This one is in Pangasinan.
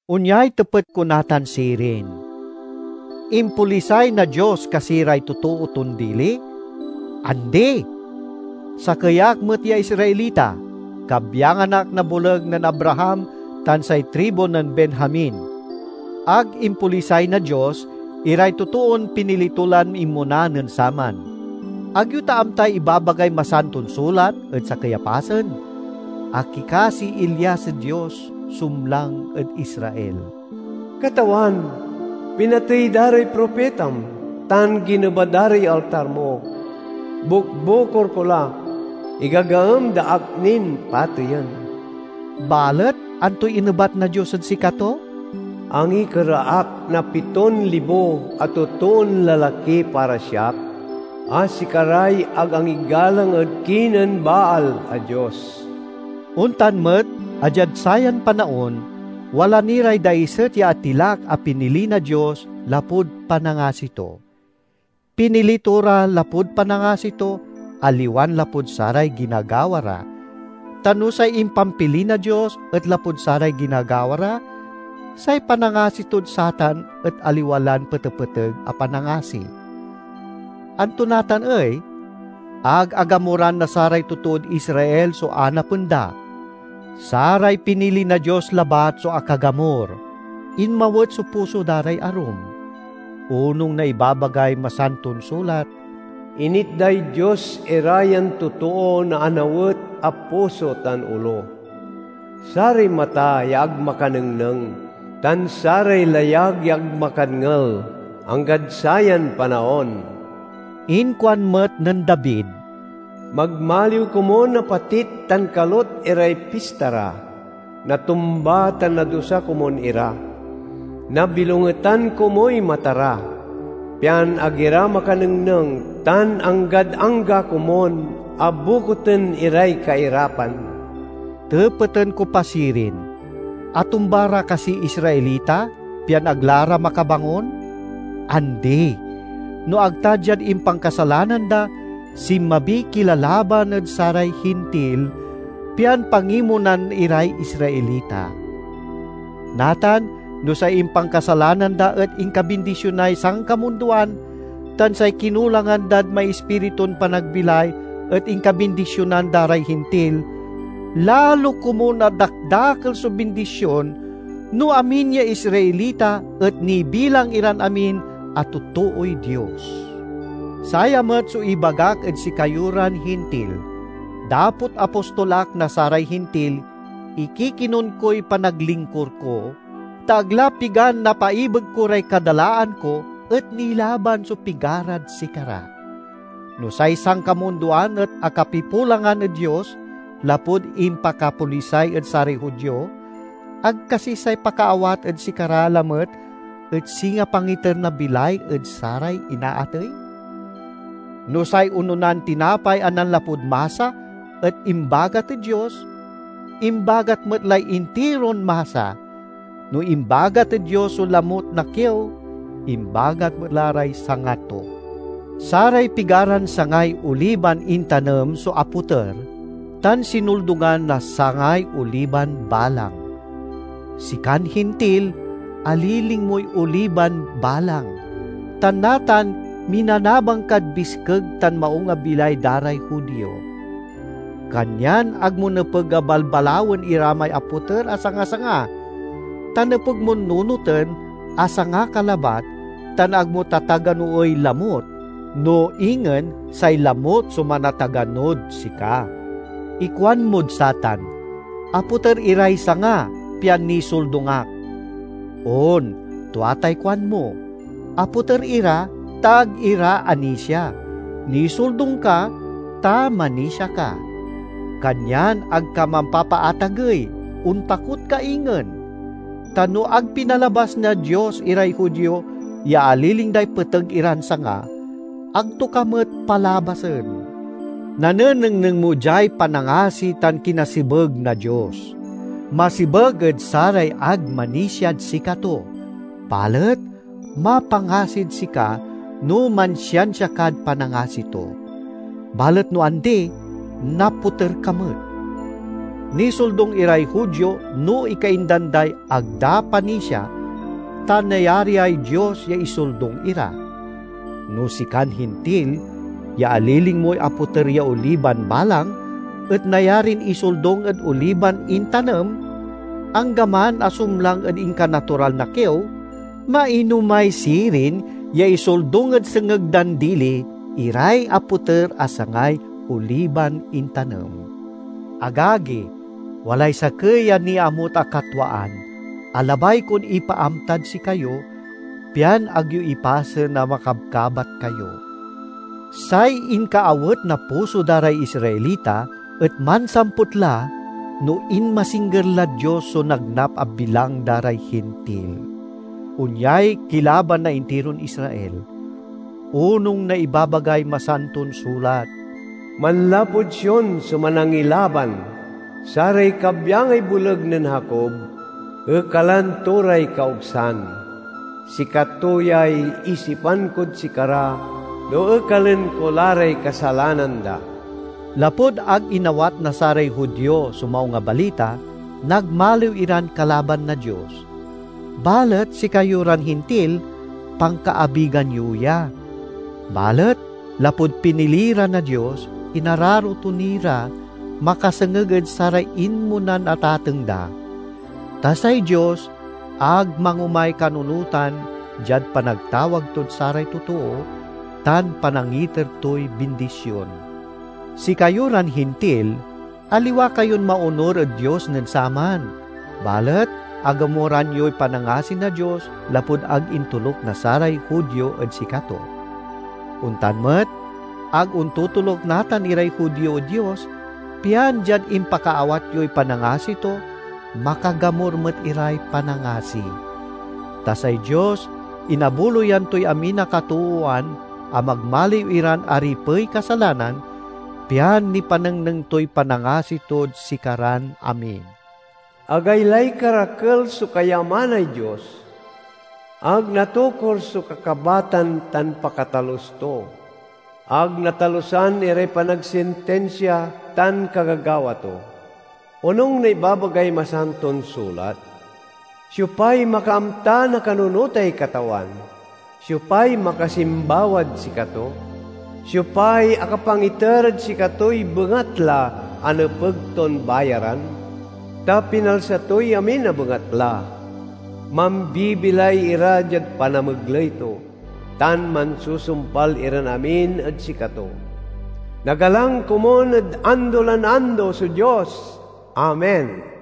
Onyay tepet ko natan sirin: Impolisay na Dios kasi ray totoo ton dili? Andi! Sakey ak met ya Israelita, kabyangan ak na boleg nen Abraham tan say tribu nen Benjamin. Ag impolisay na Dios iray totoon pinili to lan inmona nen saman. Ag yo ta amtay ibabagay Masanton Sulat ed sakey a pasen? Akikasiy Elias ed Dios sumlang ed Israel: "Katawan, pinatey da ray propitam tan gineba da ray altar mo. Bukbukor ko la, igagaem da ak nin pateyen." Balet antoy inebat na Dios ed sikato? "Angikera ak na piton libo a totoon lalaki para siak, a sikaray ag angigalang ed kinen Baal a dios." Ontan met a diad sayan panaon, wala ni ray daiset ya atilak a pinili na Dios lapud panangasi to. Pinili to ra lapud panangasi to, aliwan lapud saray ginagawa ra; ta no say impampili na Dios et lapud saray ginagawa ra, say panangasi tod satan et aliwa lan petepeteg a panangasi. Anto natan ey? Ag agamuran na saray totood Israel so anapen da. Saray pinili na Dios labat so akagamur; inmawet so puso da ray arum. Onung na ibabagay Masanton Sulat, "Initday Dios ira yan totoo na anawet a puso tan olo; saray mata ya ag makanengneng tan saray layag ya ag makadngel, anggad sayan panaon." Inkuan met nen David, "Magmaliw komun a patit tan kalut iray pista ra; natumba tan nadusa komun ira! Nabilongetan komuy mata ra, pian ag ira makanengneng, tan anggad angga komun a bokuten iray kairapan." Tepeten ko pa sirin: Atumba ra kasiy Israelita, pian ag la ra makabangon? Andi! No ag ta diad impankasalanan da, sinmabiy kilalaban ed saray Hintil, pian pangimonan iray Israelita. Natan, no say impankasalanan da et inkabindisionay sankamundoan, tan say kinulangan dad maispiritun panagbilay et inkabindisionan da ray Hintil, lalo komun a dakdakel so bindision no amin ya Israelita et nibilang iran amin a totooy Dios. Saya met so ibagak ed sikayo ran Hintil: dapot apostol ak na saray Hintil, ikikinon koy panaglingkur ko, ta ag la pigan napaibeg ko ray kadalaan ko, et nilaban so pigarad sikara. No say sankamundoan et akapipulangan ed Dios lapud impakapolisay ed saray Judio, ag kasi say pakaawat ed sikara lamet et singa pangiter na bilay ed saray inaatey? No say ononan tinapay a nanlapud masa et imbagat ed Dios, imbagat met lay intiron masa. No imbagat ed Dios so lamut na kiew, imbagat met la ray sanga to. Saray pigaran sangay oliban intanem so apoter, tan sinoldungan na sangay oliban balang. Sikan Hintil, aliling moy oliban balang, tan natan minanabang kad biskeg tan maung a bilay da ray Judio. Kanyan ag mo nepeg a balbalawen ira may apoter a sangasanga; ta nepeg mon nunoten a sanga ka labat tan ag mo tataganoey lamut, no ingen say lamut so manataganod sika. Ikuanmod satan, "Apoter iray sanga, pian nisoldung ak." On, tua tay kuanmo. Apoter ira, ta ag ira anisia; nisoldung ka, ta manisia ka. Kanyan ag ka mampapaatagey; ontakot ka ingen. Ta no ag pinalabas na Dios iray Judio ya aliling day peteg iran sanga, ag to ka met palabasen. Nanengneng mo diay panangasi tan kinasebeg na Dios. Masebeg ed saray ag manisiad sikato, balet mapangasid sika no mansiansia kad panangasi to. Balet no andi, napoter ka met. Nisoldung iray Judio no ikaindan day ag da panisia, ta nayariay Dios ya isoldung ira. No sikan Hintil ya aliling moy apoter ya oliban balang et nayarin isoldung ed oliban intanem, anggaman a sumlang ed inkanatural na kiew, mainomay sirin ya isoldung ed sengeg dan dili iray apoter a sangay oliban intanem. Agagi, walay sakey a niamut a katwaan a labay kon ipaamtad sikayo, pian ag yo ipasen a makabkabat kayo. Say inkaawet na puso da ray Israelita et mansamput la no inmasingger lad Dios so nagnap a bilang da ray Hintil. Onyay kilaban na intiron Israel. Onung na ibabagay Masanton Sulat, "Manlapud Sion so Manangilaban. Saray kabyangay boleg nen Jacob, ekalan to ray kaogsan. Sikato yay isipan kod sikara, no ekalen ko la ray kasalanan da." Lapud ag inawat na saray Judio so Maung a Balita, nagmaliw iran kalaban na Dios. Balet sikayo ran Hintil, pankaabigan yo ya. Balet lapud pinili ra na Dios, inararo to ni ra makasengeg ed saray inmonan atateng da. Ta say Dios ag mangomay kanunotan diad panagtawag tod saray totoo, tan panangiter toy bindision. Sikayo ran Hintil, aliwa kayon maonur ed Dios nen saman, balet agamuran yoy panangasi na Dios lapud ag intoluk na saray Judio ed sikato. Ontan met, ag ontotoluk natan iray Judio ed Dios, pian diad impakaawat yoy panangasi to, makagamur met iray panangasi. Ta say Dios inabuloyan toy amin a katoowan a magmaliw iran aripey kasalanan, pian nipanengneng toy panangasi tod sikaran amin. Agaylay karakel so kayamanay Dios! Ag natokur so kakabatan tan pakatalus to! Ag natalusan iray panagsintinsia tan kagagawa to! Onung na ibabagay Masanton Sulat, "Siopay makaamta na kanunotay Katawan? Siopay makasimbawad sikato? Siopay akapangiter ed sikatoy bengatla, a nepeg ton bayaran?" Ta pinalsa toy amin a bengatla, mambibilay ira diad panamegley to, tan mansusumpal iran amin ed sikato. Nagalang komun ed ando lan ando so Dios! Amen.